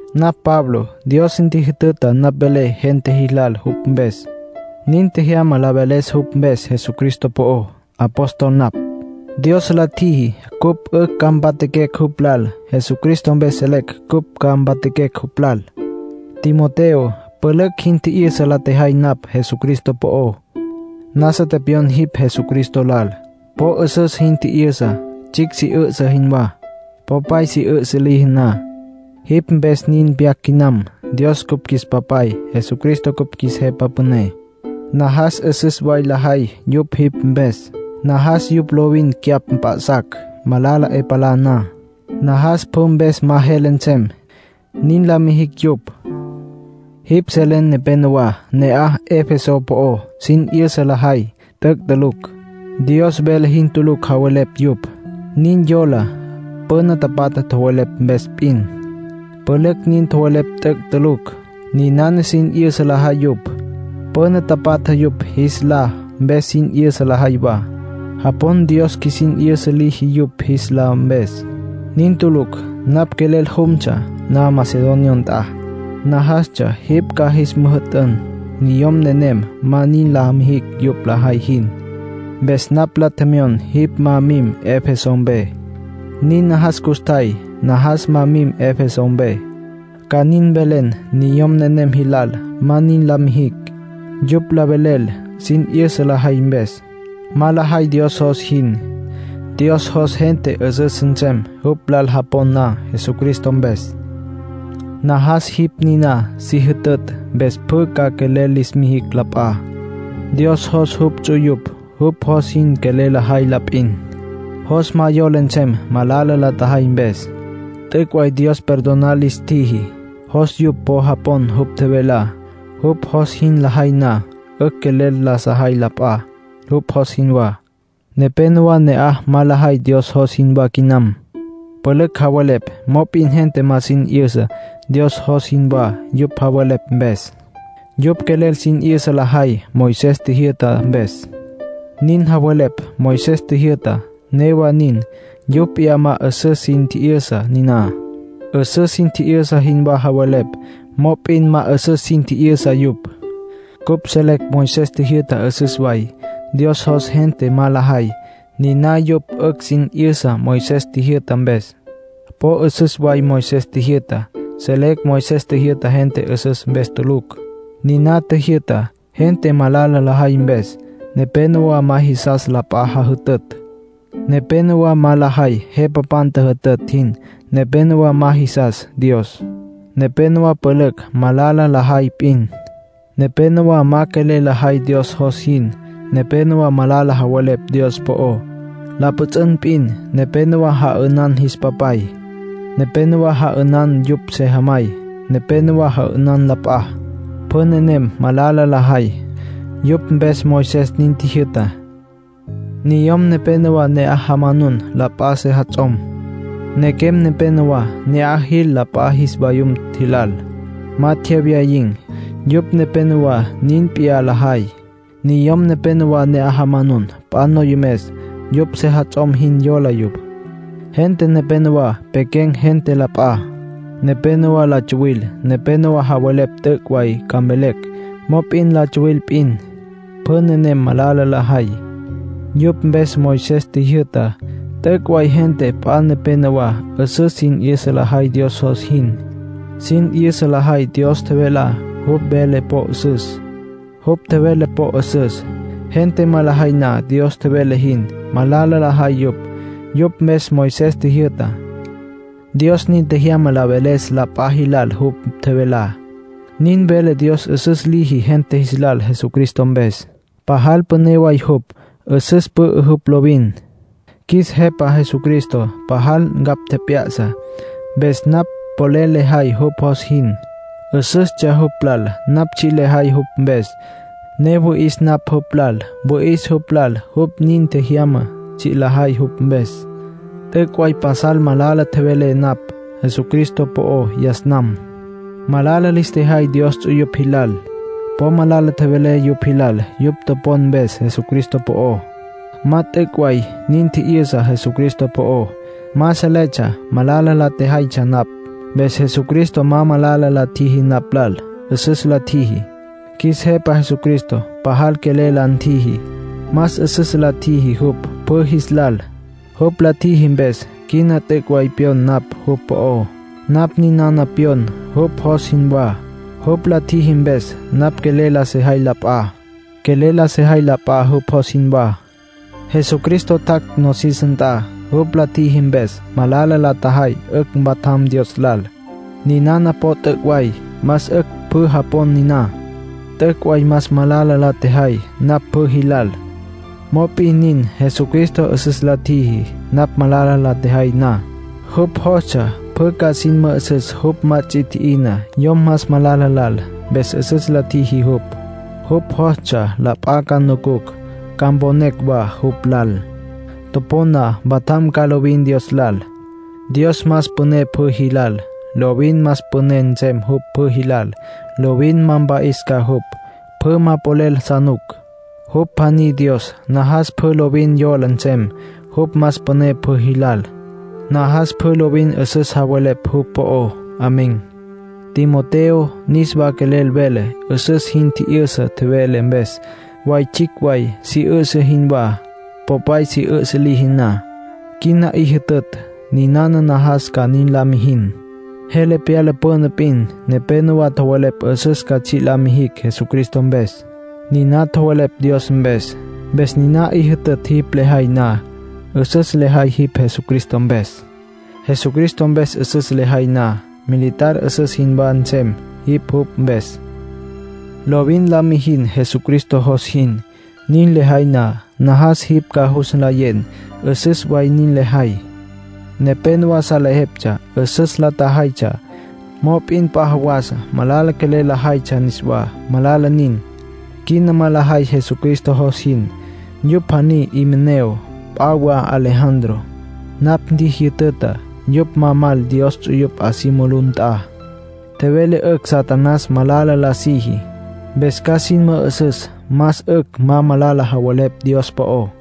Napj Pablo. Dios ntjijütüta napj mvelé gente jilal jupj mpes. Nin tjejyama la veles jupj mpes Jesucristo po'ó. Apóstol napj. Dios la tjiji cupj 'ücj ca mpatjaquecj jupj lal. Jesucristo mpes selecj cupj ca mpatjaquecj jupj lal. Timoteo, pülücj jin tji'yüsa la tjejay napj Jesucristo po'ó. Nasa tepyon jipj Jesucristo lal. Po 'üsüs jin tji'yüsa, tsjicj si 'üsǘ jinwá, popay si 'üsǘ liji na. Jipj mpes nin pyac quinam. Dios cupj qjuis Papay, Jesucristo cupj qjuis Jepa Püné. Najas 'üsüs way lajay yupj jipj mpes. Najas yupj lovin cyapj mp'a'sacj, malala 'e palá na. Najas pjü mpes ma jele nsem, nin la mijicj yupj. Jipj selen nepénowa ne'aj Efeso po'ó sin 'yüsa lajay t'üc' tulucj. Dios vele jin tulucj javelepj yupj. Nin yola püna tapatja tjowelepj mpes p'in. Pülücj nin tjowelepj t'üc' tulucj. Ninana sin 'yüsa lajay yupj. Püna tapatja yupj jis lá mpes sin 'yüsa lajay wa. Japon Dios qjuisin 'yüsa liji yupj jis lá mpes. Nin tulucj. Napj quelel jumtsja na Macedonia nt'a, najastsja jipj ca jis müjü'tün niyom nenem ma nin la mijicj yupj lajay jin, mpes napj la tjemyon jipj ma mim Efeso mpe. Nin najas custjay, najas ma mim Efeso mpe, ca nin mvelen niyom nenem jilal ma nin la mijicj. Yupj la velel sin 'yüsa lajay mpes. Ma lajay Dios jos jin. Dios jos gente 'üsüs nsem jupj lal japon na Jesucristo mpes. Najas jipj niná si jütütj mpes pjü ca quelel lis mijicj la p'a. Dios jos jupj ts'uyupj jupj jos jin quelel lajay la p'in. Jos ma yola nsem malala la tjajay mpes. T'üc' way Dios perdonar lis tjiji. Jos yupj po japon jupj tjevelá. Jupj jos jin lajay na, 'ücj quelel la sajay la p'a, jupj jos jinwá. Nepénowa ne'aj ma lajay Dios jos jinwá quinam. Pülücj javelepj, mop'in gente ma sin 'yüsa Dios jos jinwá yupj javelepj mpes. Yupj quelel sin 'yüsa lajay Moisés tjijyü'ta mpes. Nin javelepj Moisés tjijyü'tá; newa nin, yupj p'iyá ma 'üsüs sin tji'yüsa niná. 'Üsüs sin tji'yüsa jinwá javelepj, mop'in ma 'üsüs sin tji'yüsa yupj. Cupj selecj Moisés tjijyü'tá 'üsüs way. Dios jos gente ma lajay, niná yupj 'ücj sin 'yüsa Moisés tjijyü'ta mpes. Po 'üsüs way Moisés tjijyü'tá. Selecj Moisés tjijyü'ta gente 'üsüs mpes tulucj. Niná tjijyü'ta gente malala lajay mpes. Nepénowa ma jisas la p'a jajütütj. Nepénowa ma lajay jepapan tjüjütütj jin. Nepénowa ma jisas Dios. Nepénowa pülücj malala lajay p'in. Nepénowa ma quelel lajay Dios jos jin. Nepénowa malala javelepj Dios po'ó, la pjüts'ün p'in. Nepénowa ja'ünan jis papay. Nepénowa ja'ünan yupj sejamay. Nepénowa ja'ünan la p'a. Pjü nenem malala lajay. Yupj mpes Moisés nin tjijyü'ta. Niyom nepénowa ne'aj jamanun la p'a sejats'om. Nequem nepénowa ne'aj jil la p'a jis vayum jilal. Ma tjewyayin̈, yupj nepénowa nin p'iyá lajay. Niyom nepénowa ne'aj jamanun p'a noyomes, yupj sejats'om jin yola yupj. Gente nepénowa pequen̈ gente la p'a. Nepénowa la tsuwil. Nepénowa javelepj t'üc' way ca mvelecj, mop'in la tsuwil p'in. Pjü nenem malala lajay. Yupj mpes Moisés tjijyü'tá. T'üc' way gente p'a nepénowa 'üsüs sin 'yüsa lajay Dios jos jin. Sin 'yüsa lajay Dios tjevelá. Jupj tjevele po 'üsüs. Gente ma lajay na Dios tjevele jin, malala lajay yupj. Yupj mpes Moisés tjijyü'tá. Dios nin tjejyama la veles la p'a jilal jupj tjevelá. Nin velé Dios 'üsüs liji gente jis lal Jesucristo mpes. Pajal püné way jupj. 'Üsüs pü'ü jupj lovin. Qjuis Jepa Jesucristo pajal ncapj tjep'ya'sa, mpes napj polel lejay jupj jos jin. 'Üsüstsja jupj lal napj tsji' lejay jupj mpes, ne wüi'is napj jupj lal. Wüi'is jupj lal jupj nin tjejyama tsji' lejay jupj mpes. T'üc' way pasal malala tjevelé napj Jesucristo po'ó yas nam. Malala lis tjejay Dios ts'uyupj jilal. Po malala tjevelé yupj jilal yupj topon mpes Jesucristo po'ó. Ma t'üc' way nin tji'yüsa Jesucristo po'ó, ma seletsja malala la tjejaytsja napj. Mpes Jesucristo ma malala la tjiji napj lal. 'Üsüs la ntjiji. Qjuis Jepa Jesucristo pajal quelel la ntjiji. Más 'üsüs la tjiji jupj pjü jis lal. Jupj la tjiji mpes, quina t'üc' way pyon napj jupj po'ó. Napj ninana pyon jupj jos jinwá. Jupj la tjiji mpes, napj quelel la sejay la p'a. Quelel la sejay la p'a, jupj jos jinwá. Jesucristo tjac' nosis nt'a. Jupj la tjiji mpes, malala la tjajay 'ücj mpatjam Dios lal. Ninana po t'üc' way. Más 'ücj pjü japon niná. T'üc' way más malala la tjejay napj pjü jilal. Mop'in nin, Jesucristo 'üsüs la ntjiji, napj malala la tjejay na. Jupj jostsja pjü ca sin mü'üsüs jupj ma ts'i tji'ina yom más malala lal, mpes 'üsüs la ntjiji jupj. Jupj jostsja la p'a ca nucucj, ca mponecj wa jupj lal. Topon na, mpatjam ca lovin Dios lal. Dios más püné pjü jilal. Lovin más püné nsem jupj pjü jilal. Lovin ma mpa'is ca jupj. Pjü ma polel sa nuc. Jupj pjaní Dios. Najas pjü lovin yola nsem jupj más püné pjü jilal. Najas pjü lovin 'üsüs javelepj jupj po'ó. Amén. Timoteo, niswa quelel velé 'üsüs jin tji'yüsa tjevelé mpes, way tsjicj way si 'üsǘ jinwá, popay si 'üsǘ liji na. Quina 'i jütütj, ninana najas ca nin la mijin. Jele pyala püna p'in nepénowa tjowelepj 'üsüs ca tsji' la mijin Jesucristo mpes. Niná tjowelepj Dios mpes. Mpes niná 'i jütütj jin lejay na, 'üsüs lejay jipj Jesucristo mpes. Jesucristo mpes 'üsüs lejay na, militar 'üsüs jinwá nsem jipj jupj mpes. Lovin la mijin Jesucristo jos jin. Nin lejay na, najas jipj ca jus nlayen 'üsüs way nin lejay. Nepénowa salejeptsja 'üsüs la tjajaytsja, mop'in p'a jawasa malala quelel la jaytsja niswá. Malala nin. Quina ma lajay Jesucristo jos jin. Yupj pjaní Himeneo. P'a wa Alejandro. Napj tjijyütütj yupj ma mal Dios ts'uyupj 'a si mulú nt'a. Tjevelé 'ücj Satanás malala la siji. Mpes ca sin mü'üsüs más 'ücj ma malala javelepj Dios po'ó.